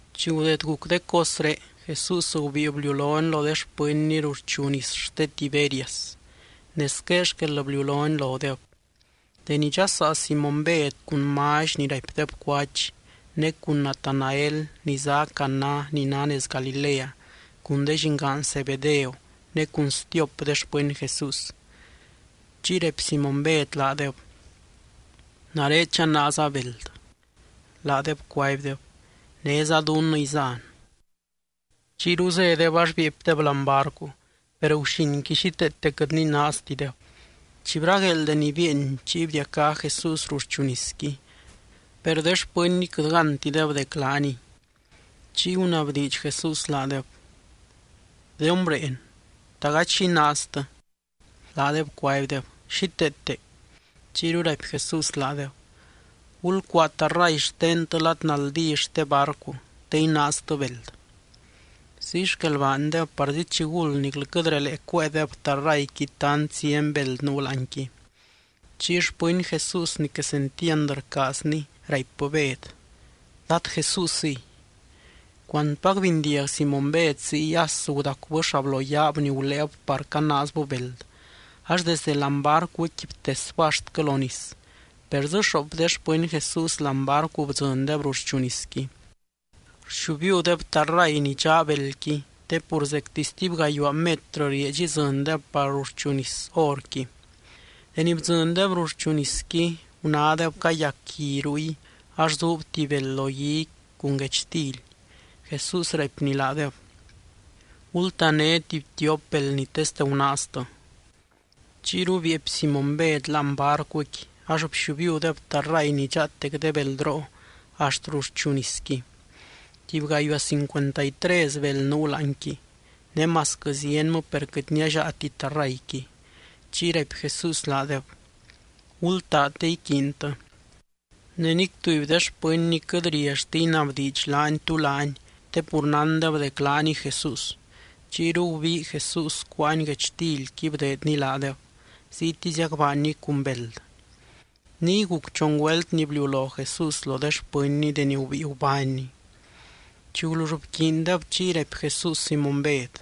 Chi gudeed guc de cosré, Jesús gubíi bliulony lo de xpɨnny ruxchu nis xte Tiberias. Ne squé xquel bliulony lodeb: Deni dxasaa Simóny Bed, cun Mally ni raipdeb Cuach, ne cun Natanael ni zá Caná ni ná nez Galilea, cun de llingaan Zebedeo ne cun stiop de xpɨny Jesús. Chiy raipy Simóny Bed laadeb: —Nare chanaaza beld. Laadeb cuaibdeb: —Néza dunnɨ izan. Chiyru zédeb ax bieepydeb láani barcu, per guxinqui xíteete quɨt ninaaztideb. Chi bragueel deni bieeny chiy bdiacá Jesús ruxchu nisqui, per de xpɨnnyqui quɨt gántideb dec laaniy. Chiy gunabdiidx Jesús laadeb: —De hombreen, ¿ta gady xi inaaztɨ? Laadeb cuaibdeb: —Xíteete. Chiyru raipy Jesús laadeb: —Gulcuaa tarray xtentɨ lad naldí xte barcu, te inaaztɨ beld. Ziy xquel baandeb, parzi chiguld niclɨ quɨt relee cuéedeb tarrayqui tant zieny beld nuu láanqui. Chiy xpɨny Jesús ni quesentiand rcaazny, raipbɨ Bed: —¡Dad Jesúsiy! Cuantpac bindiag Simóny Bed ziy, as gudacubɨ xabloyaab ni guléeb par canaazbɨ beld, ax desde láani barcuqui btesbɨ axtquɨ lo nis. Per dzɨ xoop de xpɨny Jesús láani barcu bdzɨndeb ruxchu nisqui. Rxiubiudeb tarray ni dxaa beldqui, te pur zecti stuby gayuaa metrɨ rieedx idzɨndeb par ruxchu nis horqui. Deni bdzɨndeb ruxchu nisqui, gunádeb cayac gui ruy ax zuub tuby beld lo guiqui, cun guechtily. Jesús raipny laadeb: —Gultané tuby tiop beld ni teste gunaaztɨ. Chiyru bieepy Simóny Bed láani barcuqui, ax bxiubiudeb tarray ni dxaatec de beldroo axt ruxchu nisqui. Tuby gayuaa cincuenta y tres beld nuu láanqui. Ne masquɨ zienmɨ, per quɨt niallaati tarrayqui. Chiy raipy Jesús laadeb: —Gultaa te iquiintɨ. Ne nic tuby de xpɨnny quɨt riallti inabdiidx laany tú laany, te pur nándeb dec laaniy Jesús. Chiyru gubii Jesús, cuáany guechtilqui bdeedny laadeb, ziytiziac baanny cun beld. Niy guc chon güelt ni bliulo Jesús lo de xpɨnny deni gubíi gubánny. Chi gulull bquiindeb chiy raipy Jesús Simóny Bed: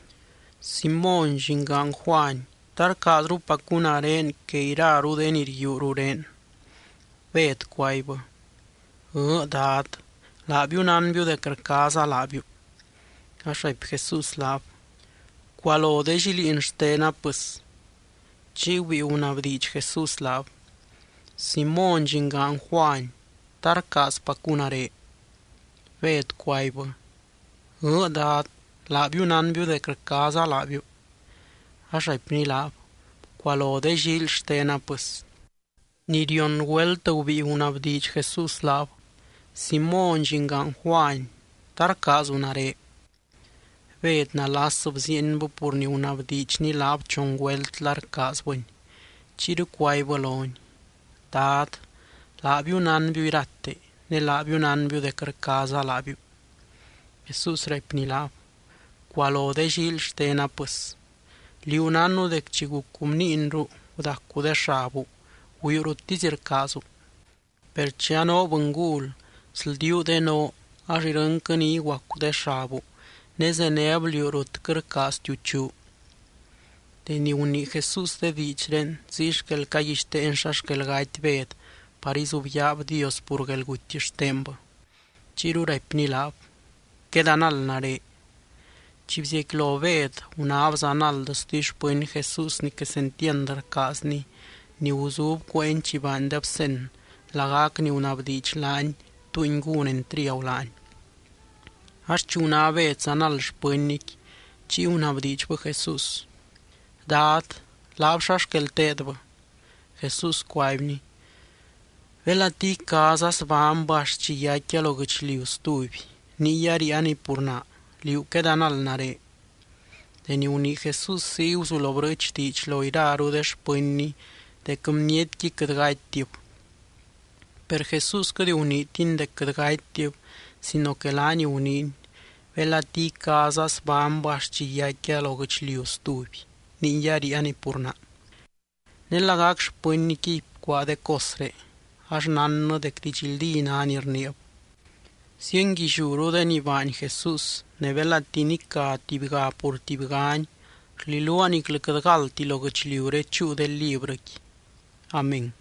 —Simóny, llingaan Juany, ¿ta rcaazrupacu nare que iraru de ni rguiuu rurén? Bed cuaibbɨ: —Ɨɨ́, Dad, laabiu nánbiu dec rcaaza laabiu. Ax raipy Jesús laab: —Bcualo de lliliin xtena pɨs. Chiy gubíi gunabdiidx Jesús laab: —Simóny, llingaan Juany, ¿ta rcaazpacu nare? Bed cuaibbɨ: —Ɨɨ́, Dad, laabiu nánbiu dec rcaaza laabiu. Ax raipny laab: —Bcualo de llíily xtena pɨs. Ni rion güelt gubíi gunabdiidx Jesús laab: —Simóny, llingaan Juany, ¿ta rcaazu nare? Bed nalas bziienbɨ pur ni gunabdiidxny laab chon güelt la rcaazbɨny. Chiyru cuaibbɨ lony: —Dad, laabiu nánbiu irate. Ne laabiu nánbiu dec rcaaza laabiu. Jesús raipny laab: —Bcualo de llíily xtena pɨs. Liú nánnu dec chi gucu bniinru gudacu de xabu, güiu ruttisy rcaazu. Per chi anoo bɨngul, sldiuu de noo ax irɨnquɨ ni iguacu de xabu ne zenéb liú rut quɨt rcaaztiu chuu. Deni gunii Jesús de diidxré, ziy xquel caguixteeny xa xquel gaty Bed par izubyaab Dios pur guelguty xtenbɨ. Chiyru raipny laab: —¡Quedanald nare! Chi bziecquilo Bed, gunáb zanald stuby xpɨny Jesús ni quesentiand rcaazny, ni guzub cueeny chi baandeb cen, lagac ni gunabdiidx laany, túngui gún entriagu laany. Ax chi guná Bed zanald xpɨnnyqui, chiy gunabdiidxbɨ Jesús: —Dad, laab, xa xquel teedbɨ. Jesús cuaibny: —Belati icaaza zbánybɨ axt chi yaicquia lo guɨchliu stuby, niy aríianiy pur naa. Liú quedanald nare. Deni gunii Jesús ziy guzulo brɨɨch diidx lo iraru de xpɨnny dec bnietqui quɨt gatytib. Per Jesús quɨt guniitiny dec quɨt gatytib sino que laany guniiny: “Belati icaaza zbánybɨ axt chi yaicquia lo guɨchliu stuby, niy aríianiy pur naa.” Ne lagac xpɨnnyquiy bcuaa de cosré. Ax nánnɨ dec didxldí ná ni rniib. Zienguilliúru de ni baany Jesús ne belati nicá tubyga pur tubygani, rliluaa niclɨ quɨt galdti lo guɨchliuré chúu de librɨqui. Amén.